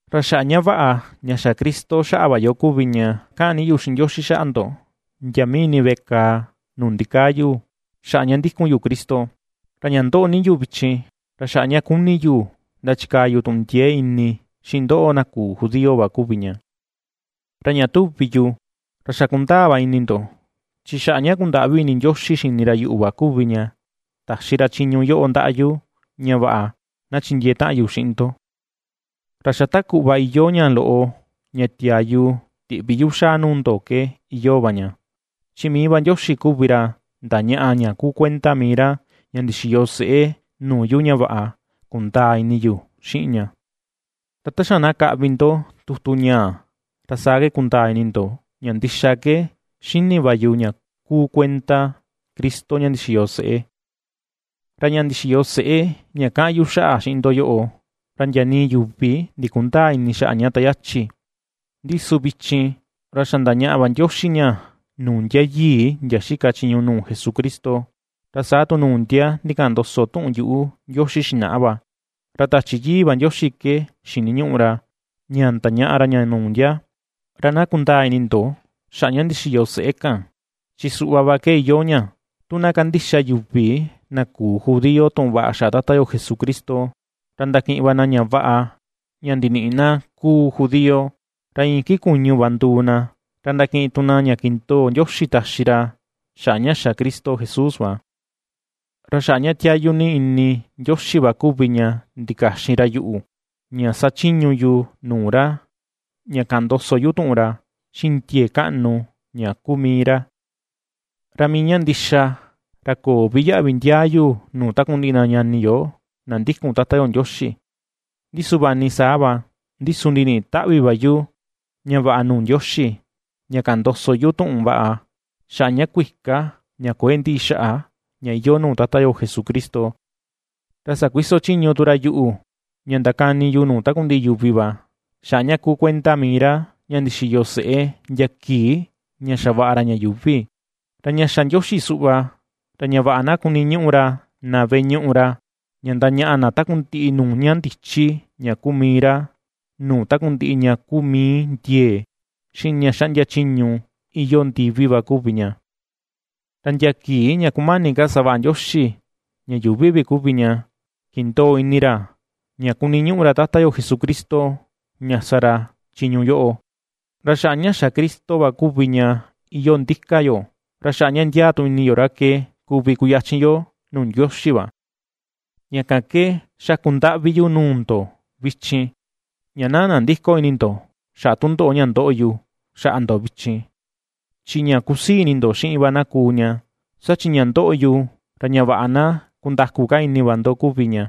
Ra xaꞌa ña vaꞌa ña xa Cristo xaꞌa va yo kuvi ña kaꞌan ni yu xiꞌin Ndioxi xaꞌa ndo ndia mii ini veꞌe kàà nuu ndikaa yu xaꞌa ña ndikun yu Cristo. Ra ña ndoꞌo ni yu vichin, ra xaꞌa ña ^kuni yu ndachikaa yu tuꞌun ndiee ini xiꞌin ndoꞌo na küu judío va kuvi ña. Ra ña tuvi yu, ra xa ^kundaa va ini ndo chi xaꞌa ña kundaꞌvi ini Ndioxi xini ra yuꞌu va kuvi ña, taxi ra chiñu yoꞌo ndaꞌa yu ña vaꞌa na chindiee taꞌan yu xiꞌin ndo. Ra xa ta kuꞌva iyoo ña loꞌo ña tiaa yu tiꞌvi yu xaa nuu ndo ke iyoo va ña, chi mii va Ndioxi kuvi ra ndañaꞌa ña kuu kuenda mii ra ña ndixiyo seꞌe nuu yu ña vaꞌa kundaa ini yu xiꞌin ña. Ra ta xa na kaꞌvi ndo tutu ñaa, ra saa ke kundaa ini ndo ña ndixa ke ^xini va yu ña kuu kuenda Cristo ña ndixiyo seꞌe. Ra ña ndixiyo seꞌe ña kaꞌan yu xaꞌa xiꞌin ndo yoꞌo, ra ndia nii yuvi ndikundäa ini xaꞌa ña ta yachi, ndi su vichin, ra xa ndañaꞌa va Ndioxi ña nuu ndia yii ndia xika chiñu nuu Jesucristo, ra saa tu nuu ndia ndikaꞌan ndoso tuꞌun yuꞌu Ndioxi xinaꞌa va, ra Tachi Yii va Ndioxi ke xiniñuꞌu ra ña ndañaꞌa ra ña nuu ndia. Ra na kundaa ini ndo, xaꞌa ña ndixiyo seꞌé kan, chi suꞌva va ke iyoo ña: tu na kandixa yuvi na küu judío tuꞌun vaꞌa xaꞌa Tata Jesucristo ra ndakiꞌin va na ña vaꞌa ña ndiniꞌi na kuu judío, ra iin iki kuñu va nduu na, ra ndakiꞌin tu na ña kindoo Ndioxi taxi ra xaꞌa ña xa Cristo Jesús va. Ra xaꞌa ña tiayu ni ini Ndioxi va kuvi ña ndikaxin ra yuꞌu, ña sachiñu yu nuu ra ña kaꞌan ndoso yu tuꞌun ra, xiꞌin ndiee kaꞌnu ña kuu mii ra. Ra mii ña ndixa ra köo vi yaꞌvi ndiaa yu nuu takundiꞌi na ñani yo na ndikun Tata yo Ndioxi; ndi su vaꞌa ni saa va, ndi su ndiniꞌi taꞌvi va yu ña vaꞌa nuu Ndioxi, ña kaꞌan ndoso yu tuꞌun vaꞌa xaꞌa ña kuika ña kuëe ndiꞌi xaꞌa ña iyoo nuu Tata yo Jesucristo. Ra sakuiso chiñu tu ra yuꞌu ña ndakani yu nuu takundiꞌi yuvi va, xaꞌa ña kuu kuenda mii ra, ña ndixiyo seꞌé ndia kii ña xavaꞌa ra ña yuuvi. Ra ña xa Ndioxi suꞌva, ra ña vaꞌa na kuniñuꞌu ra na veꞌe ñuꞌu ra ña ndañaꞌa na takundiꞌi nuu ña ndichi ña kuu mii ra, nuu takundiꞌi ña kuu mii ndiee, xiꞌin ña xaꞌndia chiñu iyoo ndivi va kuvi ña. Ra ndia kii ña kumani ka savaꞌa Ndioxi ña yuuvi vi kuvi ña kindoo ini ra ña kuniñuꞌu ra Tata yo Jesucristo ña sa ra chiñu yoꞌo. Ra xaꞌa ña xa Cristo va kuvi ña iyoo ndika yo, ra xaꞌa ña ndiaa tu ini yo ra ke kuvi kuyachin yo nuu Ndioxi va. Ña kan ke, xakun ndaꞌvi yu nuu ndo vichin, ña na nandïko ini ndo xaꞌa tundoꞌo ña ndoꞌo yu xaꞌa ndo vichin, chi ña kusii ini ndo xiꞌin va na kuu ña, saa chi ña ndoꞌo yu, ra ña vaꞌa na kundaku ka ini va ndo kuvi ña.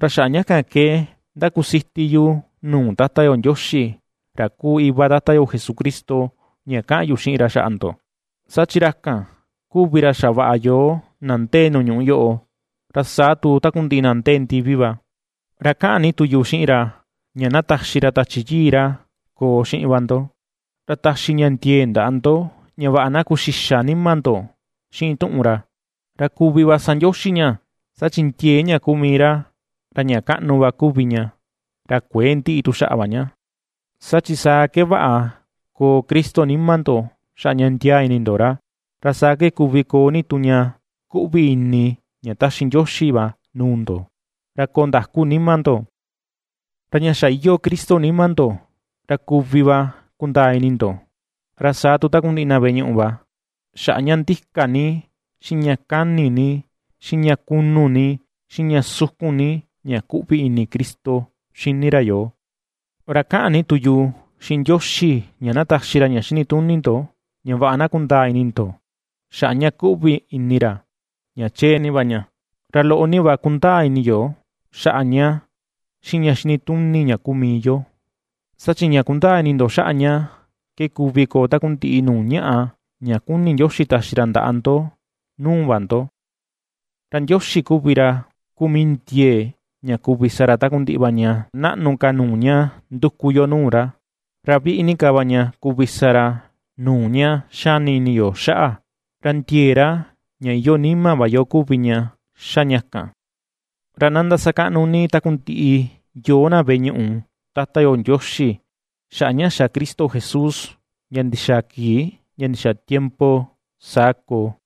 Ra xaꞌa ña kan ke ndakusiti yu nuu Tata yo Ndioxi ra kuu iva Tata yo Jesucristo ña kaꞌan yu xiꞌin ra xaꞌa ndo, saa chi ra kan, kuvi ra xavaꞌa yoo na ndee nuu ñuꞌu yoꞌo, ra saa tu takundiꞌi na ndee ndivi va. Ra ^kaꞌan ni tu yu xiꞌin ra, ña na taxi ra Tachi Yii ra koo xiꞌin va ndo, ra taxi ña ndiee ndaꞌa ndo, ña vaꞌa na kuu xixa nima ndo xiꞌin tuꞌun ra, ra kuvi va sa Ndioxi ña, saa chi ndiee ña kuu mii ra, ra ña kaꞌnu va kuvi ña, ra kuëe ndiꞌi tu xaꞌa va ña. Saa chi saa ke vaꞌa koo Cristo nima ndo xaꞌa ña ndiaa ini ndo ra, ra saa ke kuvi koo ni tu ña kuꞌvi ini ña taxi Ndioxi va nuu ndo, ra koo ndaku nima ndo. Ra ña xa iyoo Cristo nima ndo, ra kuvi va kundaa ini ndo, ra saa tu takundiꞌi na veꞌe ñuꞌu va, xaꞌa ña ndika ni, xiꞌin ña kani ni, xiꞌin ña kunu ni, xiꞌin ña sukun ni ña kuꞌvi ini Cristo xini ra yoo. Ra kaꞌan ni tu yu xiꞌin Ndioxi ña na taxi ra ña xinituni ndo ña vaꞌa na kundaa ini ndo xaꞌa ña kuꞌvi ini ra ña chee ni va ña, ra loꞌo ni va kundaa ini yo xaꞌa ña xiꞌin ña xinituni ña kuu mii yo. Saa chi ña kundaa ini ndo xaꞌa ña ke kuvi koo takundiꞌi nuu ñaꞌa ña kuni Ndioxi taxi ra ndaꞌa ndo nuu va ndo. Ra Ndioxi kuvi ra kuu mii ndiee, ña kuvi sa ra takundiꞌi va ña naꞌnu ka nuu ña nduku yo nuu ra, ra viꞌi ni ka va ña kuvi sa ra nuu ña xani ini yo xaꞌa, ra ndiee ra ña iyoo nima va yo kuvi ña ^xa ña kan. ¡Ra na ndasakaꞌnu ni takundiꞌi yoo na veꞌe ñuꞌu, Tata yo Ndioxi xaꞌa ña xa Cristo Jesús, ndia ndixaa kii ndia ndixaa tiempo! Saa koo.